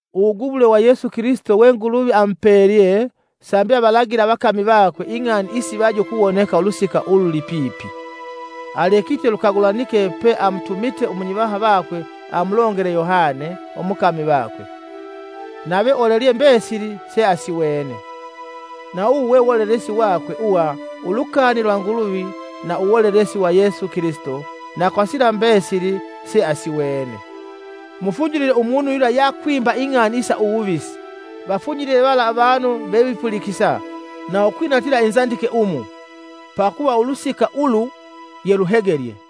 Uwugubulwe Yesu Kilisito we Nguluvi amupeelye sambi avalagile avakami vakwe ing'ani isivaje ukuwoneka ulusika ululipipi, alekite lukagulanike pe amutumite umunyivaha vakwe amulongele Yohane, umukami vakwe, nave olelye mbesili seasiwene. Na uwu we wolelesi wakwe uwa ulukani lwa Nguluvi na uwolelesi wa Yesu Kilisito na kwa sila mbesili se asiwene. Mufunyilile umunu yula yeakwimba kwa liswi ing'ani isa uwuvisi, vafunyilile vala avanu vevipulikisa na ukwinatila inzandike umu, pakuva ulusika ulu yeluhegelye.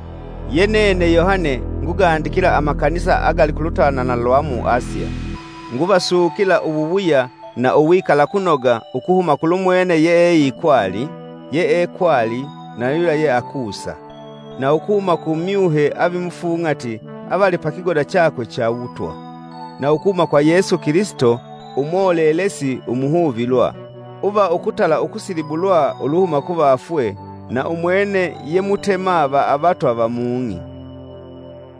Ye nene Yohane ngugandikila amakanisa agali ku lutanana lwa mu Asiya. Nguvasukila uwuwuya na uwikalakunoga ukuhuma kulumwene yeikwali, yeekwali na yula yeakusa; na ukuhuma ku myuhe avimufung'ati avali pa kigoda chakwe cha uwutwa, na ukuhuma kwa Yesu Kilisito, umolelesi umuhuvilwa, uva ukutala ukusilibulwa uluhuma kuvafwe, na umwene ye mutema va avatwa va mung'i.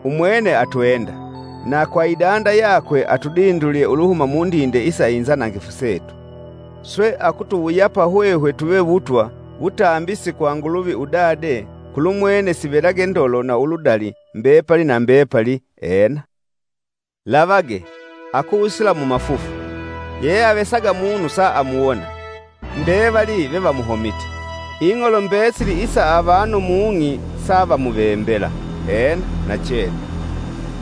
Umwene atwenda, na kwa idanda yakwe atudindulye uluhuma mundinde isa inzanangifu setu, swe akutuwuyapa hwehwe tuve wutwa, wutambisi kw Nguluvi, Udade, Kulumwene sivelage ndolo na uludali, mbepali na mbepali! Ena. Lavage! Akusila mumafufu! Yeyeavesaga munu saamuwona, mbevali vevamuhomite, Ing'olo mbesili isa avanu mung'i savamuvembela. Ena! Nachene.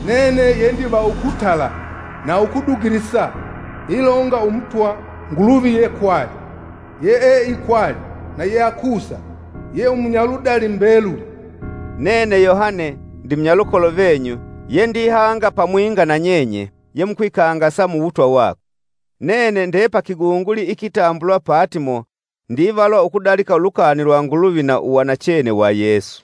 “Nene ye ndiva ukutala na ukudugilisa.” Ilonga Umutwa Nguluvi yekwali, yeeikwali na yeakusa ye umunyaludali mbeluli. Nene Yohane, ndimunyalukolo venyu, ye ndihanga pamwinga nanyenye yemukwikangasa muwutwa wakwe. Nene nde pa kigunguli ikitambulwa Patimo ndivalwa ukudalika ulukani lwa Nguluvi na uwanachene wa Yesu.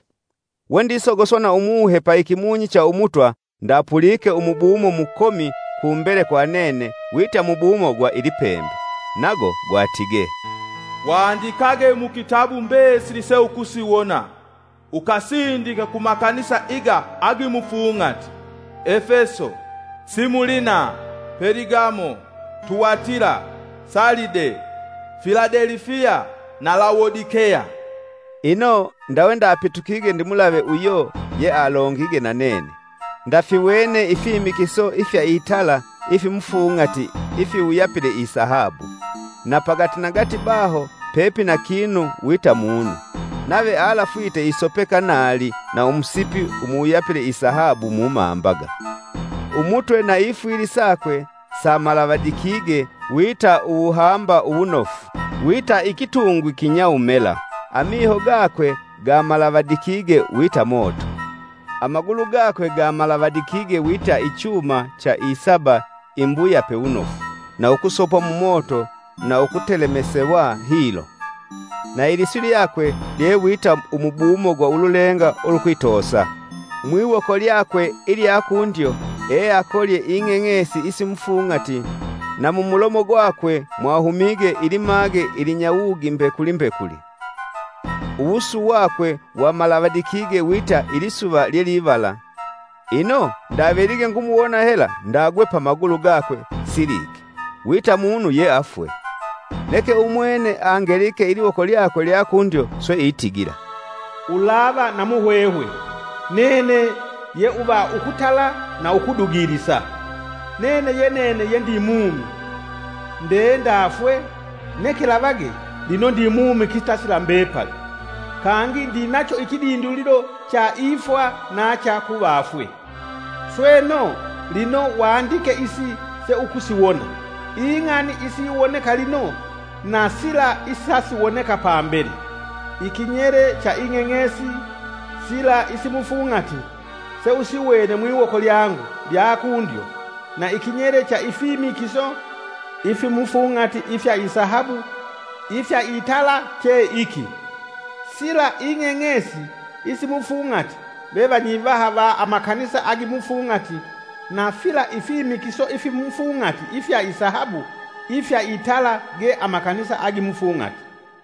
Wendisogoswa na Umuhe pa ikimunyi cha Umutwa, ndapulike umubumo mukomi kumbele kwa nene wita mubumo gwa ilipembe. Nago gwatige, “Wandikage mukitabu mbesili seukusiwona, ukasindike ku makanisa iga agimufung'ati: Efeso, Similina, Peligamo, Tuwatila, Salide, Filadelifiya na Lawodikeya.” Ino, ndawe ndapitukige ndimulave uyo yealongige nanene, ndafiwene ifimikiso ifya itala ifimufung'ati ifiwuyapile isahabu, na pagatinagati baho pepina kinu wita munu, nave alafwite isopeka naali na umusipi umuwuyapile isahabu mumambaga. Umutwe na ifwili sakwe samalavadikige wita uwuhamba uwunofu, wita ikitungwi kinyawumela; amiho gakwe gamalavadikige wita moto, amagulu gakwe gamalavadikige wita ichuma cha isaba imbuyape wunofu na ukusopwa mumoto na ukutelemesewa hilo, na iliswi lyakwe lye wita umubumo gwa ululenga ulukwitoosa. Mwiwoko lyakwe ilya kundyo, eakolye ing'eng'esi isimufung'ati, na mumulomo gwakwe mwahumige ilimage ilinyawugi mbekuli mbekuli. Uwusu wakwe wamalavadikige wita ilisuva lyelivala. Ino, ndavelige ngumuwona hela ndagwe pamagulu gakwe siliike wita munu ye afwe. Neke umwene angelike iliwoko lyakwe lya kundyo swe itigila, “Ulava na muhwehwe! Nene ye uva ukutala na ukudugilisa. Nene ye nene ye ndi mumi! Nde ndafwe, neke, lavage, lino ndimumi kitasila mbepali. Kangi ndinacho ikidindulilo cha Ifwa na cha Kuvafwe. Sweno, lino wandike isi seukusiwona, ing'ani isiwoneka lino na sila isasiwoneka pambele. Ikinyele cha ing'eng'esi sila isimufung'ati seusiwene mwiwoko lyangu lya kundyo, na ikinyele cha ifimikiso ifimufung'ati ifya isahabu ifya itala che iki: Sila ing'eng'esi isimufung'ati ve vanyivaha va amakanisa agimufung'ati, na fila ifimikiso ifimufung'ati ifya isahabu ifya itala ge amakanisa agimufung'ati.